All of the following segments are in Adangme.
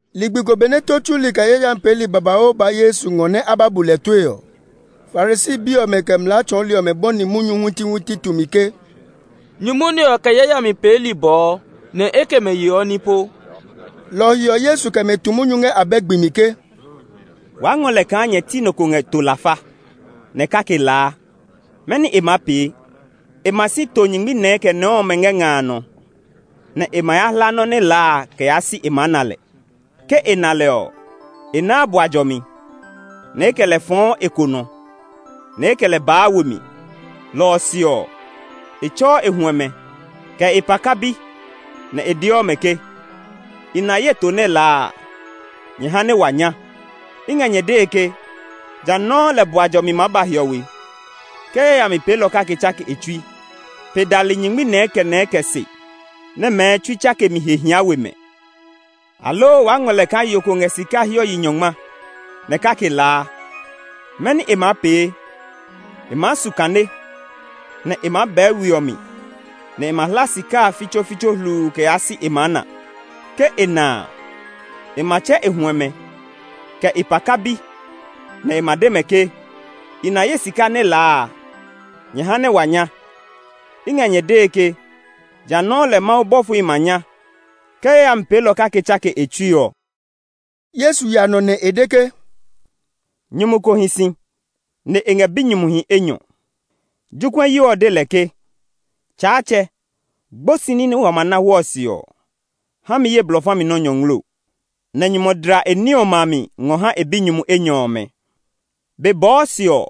Ligbi ko benɛ tó tsuli, kɛ yayami peeli babauu ba Yesu ngɔ nɛ a ba bu lɛ tue ɔ, Farisi bi ɔmɛ, kɛ mlaa tsɔɔli ɔmɛ bɔni munyu huitihuiti tumi ke, “Nyumu nɛ ɔ kɛ yayami peeli bɔɔ, nɛ e kɛ mɛ yeɔ ní po.” Lɔ ɔ he ɔ, Yesu kɛ mɛ tu munyu ngɛ abɛ gbi mi ke, “Waa ngɔ lɛ kaa nyɛ ti nɔ ko ngɛ to lafa, nɛ́ kake laa a, mɛni e maa pee? E ma si to nyingmi nɛɛ kɛ nɛɛ ɔmɛ ngɛ nga a nɔ, nɛ e ma ya hla nɔ́ nɛ laa a kɛ yaa si e maa na lɛ. Ke e na lɛ ɔ, e naa bua jɔmi, nɛ e kɛ lɛ fɔɔ e konɔ, nɛ e kɛ lɛ baa we mi. Lɔ ɔ se ɔ, e tsɛɔ e huɛmɛ, kɛ e paka bi, nɛ e deɔ mɛ ke, ‘I na ye to nɛ laa a; nyɛ ha nɛ wa nya!’ I ngɛ nyɛ dee ke, jã nɔuu lɛ bua jɔmi maa ba hiɔwe, ke yayami peelɔ kake tsake e tsui, pe dali nyingmi nɛɛ kɛ nɛɛ kɛ se, nɛ mɛɛ tsui tsakemi he hia we mɛ. “Aloo waa ngɔ lɛ kaa yo ko ngɛ sika hiɔ yi nyɔngma, nɛ kake laa. Mɛni e maa pee? E maa su kane, nɛ e maa bɛɛ we ɔ mi, nɛ e ma hla sika a fitsofitso hluu kɛ yaa si e maa na. Ke e na a, e ma tsɛ e huɛmɛ, kɛ e paka bi, nɛ e ma de mɛ ke, ‘I na ye sika nɛ laa a; nyɛ ha nɛ wa nya!’ I ngɛ nyɛ dee ke, jã nɔuu lɛ Mawu bɔfohi ma nya, ke yayami peelɔ kake tsake e tsui ɔ.” Yesu ya nɔ nɛ e de ke, “Nyumu ko hi si, nɛ e ngɛ binyumuhi enyɔ. Jokuɛyo ɔ de lɛ ke, ‘Tsaatsɛ, gbosi ní nɛ wa ma na hwɔɔ se ɔ, ha mi ye blɔ fa mi nɔ́ nyɔngloo.’ Nɛ nyumu ɔ dla e ní ɔmɛ a mi ngɔ ha e binyumu enyɔ ɔmɛ. Be bɔɔ se ɔ,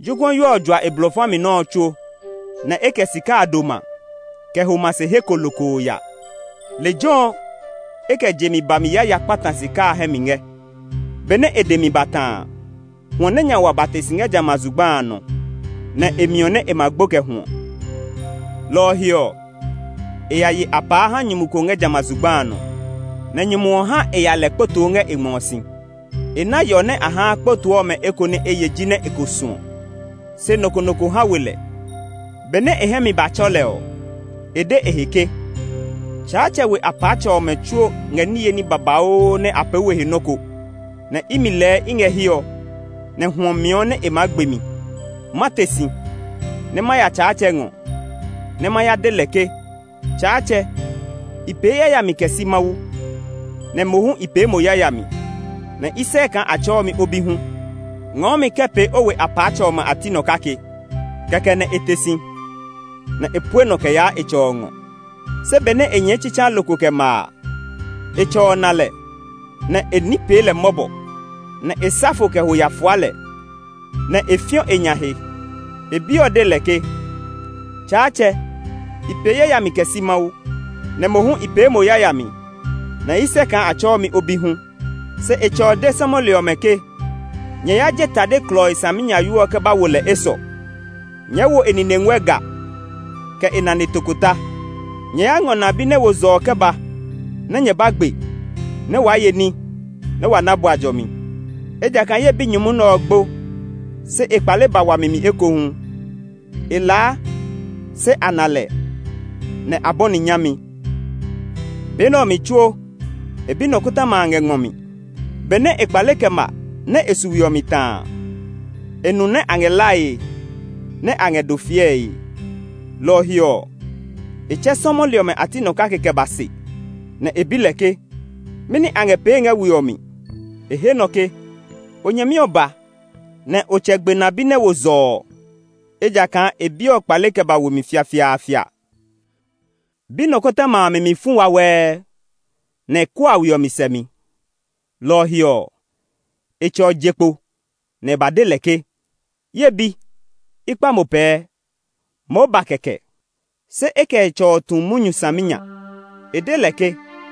jokuɛyo ɔ jua e blɔ fami nɔ́ ɔ tsuo, nɛ e kɛ sika a doma kɛ ho ma se he ko lokoo ya. Lejɛ ɔ e kɛ je mi bami yaya ya kpata e sika a hɛ mi ngɛ. Benɛ e dɛ mi ba ta a, hwɔ nɛ nya wa ba te si ngɛ jamɛ a zugba a nɔ, nɛ e miɔ nɛ e ma gbo kɛ hwɔ. Lɔ ɔ he ɔ, e ya ye apaa ha nyumu ko ngɛ jamɛ a zugba a nɔ, nɛ nyumu ɔ ha e ya lɛ kpotoo ngɛ e ngmɔ si. E ná yɔ nɛ a haa kpotoo ɔmɛ ɔ eko nɛ e ye jinɛ e ko suɔ; se nɔ ko nɔ ko ha we lɛ. Benɛ e hɛ mi ba tsɔ lɛ ɔ, e de e he ke, ‘Tsaatsɛ we apaatsɛmɛ ɔmɛ tsuo ngɛ niye ní babauu nɛ a pee we he nɔ́ ko, nɛ imi lɛɛ i ngɛ hiɛ ɔ, nɛ hwɔ miɔ nɛ e maa gbe mi! Ma te si, nɛ ma ya tsaatsɛ ngɔ, nɛ ma ya de lɛ ke, Tsaatsɛ, i pee yayami kɛ si Mawu, nɛ mo hu i pee mo yayami, nɛ i sɛ kaa a tsɛɔ mi o bi hu; ngɔɔ mi kɛ pee o we apaatsɛmɛ ɔmɛ a ti nɔ kake.’ Kɛkɛ nɛ e te si, nɛ e pue nɔ kɛ yaa e tsɛ ɔ ngɔ. “Se benɛ e nyɛɛ tsitsaa lokoo kɛ ma a, e tsɛ ɔ na lɛ, nɛ e ní pee lɛ mɔbɔ, nɛ e sa fo kɛ ho ya fua lɛ, nɛ e fiɔ e nya he. E bi ɔ de lɛ ke, ‘Tsaatsɛ, i pee yayami kɛ si Mawu, nɛ mo hu i pee mo yayami, nɛ i sɛ kaa a tsɛɔ mi o bi hu.’ Se e tsɛ ɔ de sɔmɔli ɔmɛ ke, ‘Nyɛ ya je tade klɔii saminyayoo ɔ kɛ ba wo lɛ esɔ. Nyɛɛ wo e nine nguɛ ga, kɛ e nane tokota. Nyɛ ya ngɔ na bi nɛ wo zɔ ɔ kɛ ba nɛ nyɛ ba gbe nɛ waa ye ní, nɛ wa na bua jɔmi. Ejakaa ye binyumu nɛ ɔ gbo, se e kpale ba wami mi ekohu; e laa, se a na lɛ.’ Nɛ a bɔni nyami. “Be nɛ ɔ mi tsuo e bi nɔkɔtɔma a ngɛ ngmɔ mi. Benɛ e kpale kɛ ma, nɛ e su we ɔ mi ta a, e nu nɛ a ngɛ lae, nɛ a ngɛ do fiɛe. Lɔ ɔ he ɔ, e tsɛ sɔmɔli ɔmɛ a ti nɔ kake kɛ ba se, nɛ e bi lɛ ke, ‘Mɛni a ngɛ pee ngɛ we ɔ mi?’ E he nɔ ke, ‘O nyɛmi ɔ ba, nɛ o tsɛ gbe na bi nɛ wo zɔ ɔ; ejakaa e bi ɔ kpale kɛ ba we fiafiaafia.’ “Bi nɔkɔtɔma a mi mi fu wawɛɛ, nɛ e kua we ɔ mi sɛmi. Lɔ ɔ he ɔ, e tsɛ ɔ je kpo nɛ e ba de lɛ ke, ‘Ye bi, i kpa mo pɛɛ, moo ba kɛkɛ.’ Se e kɛ e tsɛ ɔ tu munyu saminya. E de lɛ ke,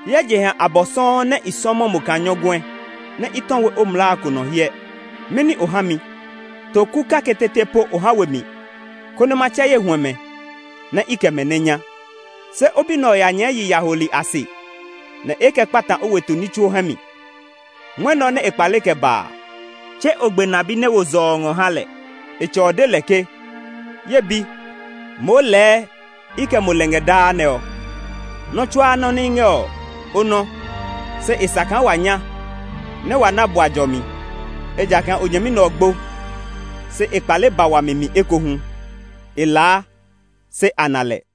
‘Hyɛ jeha abɔ sɔuu nɛ i sɔmɔ mo kaa nyɔguɛ, i tɔ we o mlaa ko nɔ hyɛ nɛ. Mɛni o ha mi? To ku kake tete po o ha we mi, konɛ ma tsɛ ye huɛmɛ, nɛ i kɛ mɛ nɛ nya! Se o bi nɛ ɔ ya nyɛɛ yi yaholi a se, nɛ e kɛ kpata o weto ní tsuo hɛ mi. Mwɔnɛ ɔ nɛ e kpale kɛ ba a, tse o gbe na bi nɛ wo zɔ ɔ ngɔ ha lɛ!’ E tsɛ ɔ de lɛ ke, ‘Ye bi, moo lɛɛ i kɛ mo lɛ ngɛ daa nɛ ɔ, nɔ́ tsuaa nɔ́ nɛ i ngɛ ɔ, o nɔ́. Se e sa kaa wa nya, nɛ wa na bua jɔmi, ejakaa o nyɛmi nɛ ɔ gbo, se e kpale ba wami mi ekohu; e laa, se a na lɛ.’”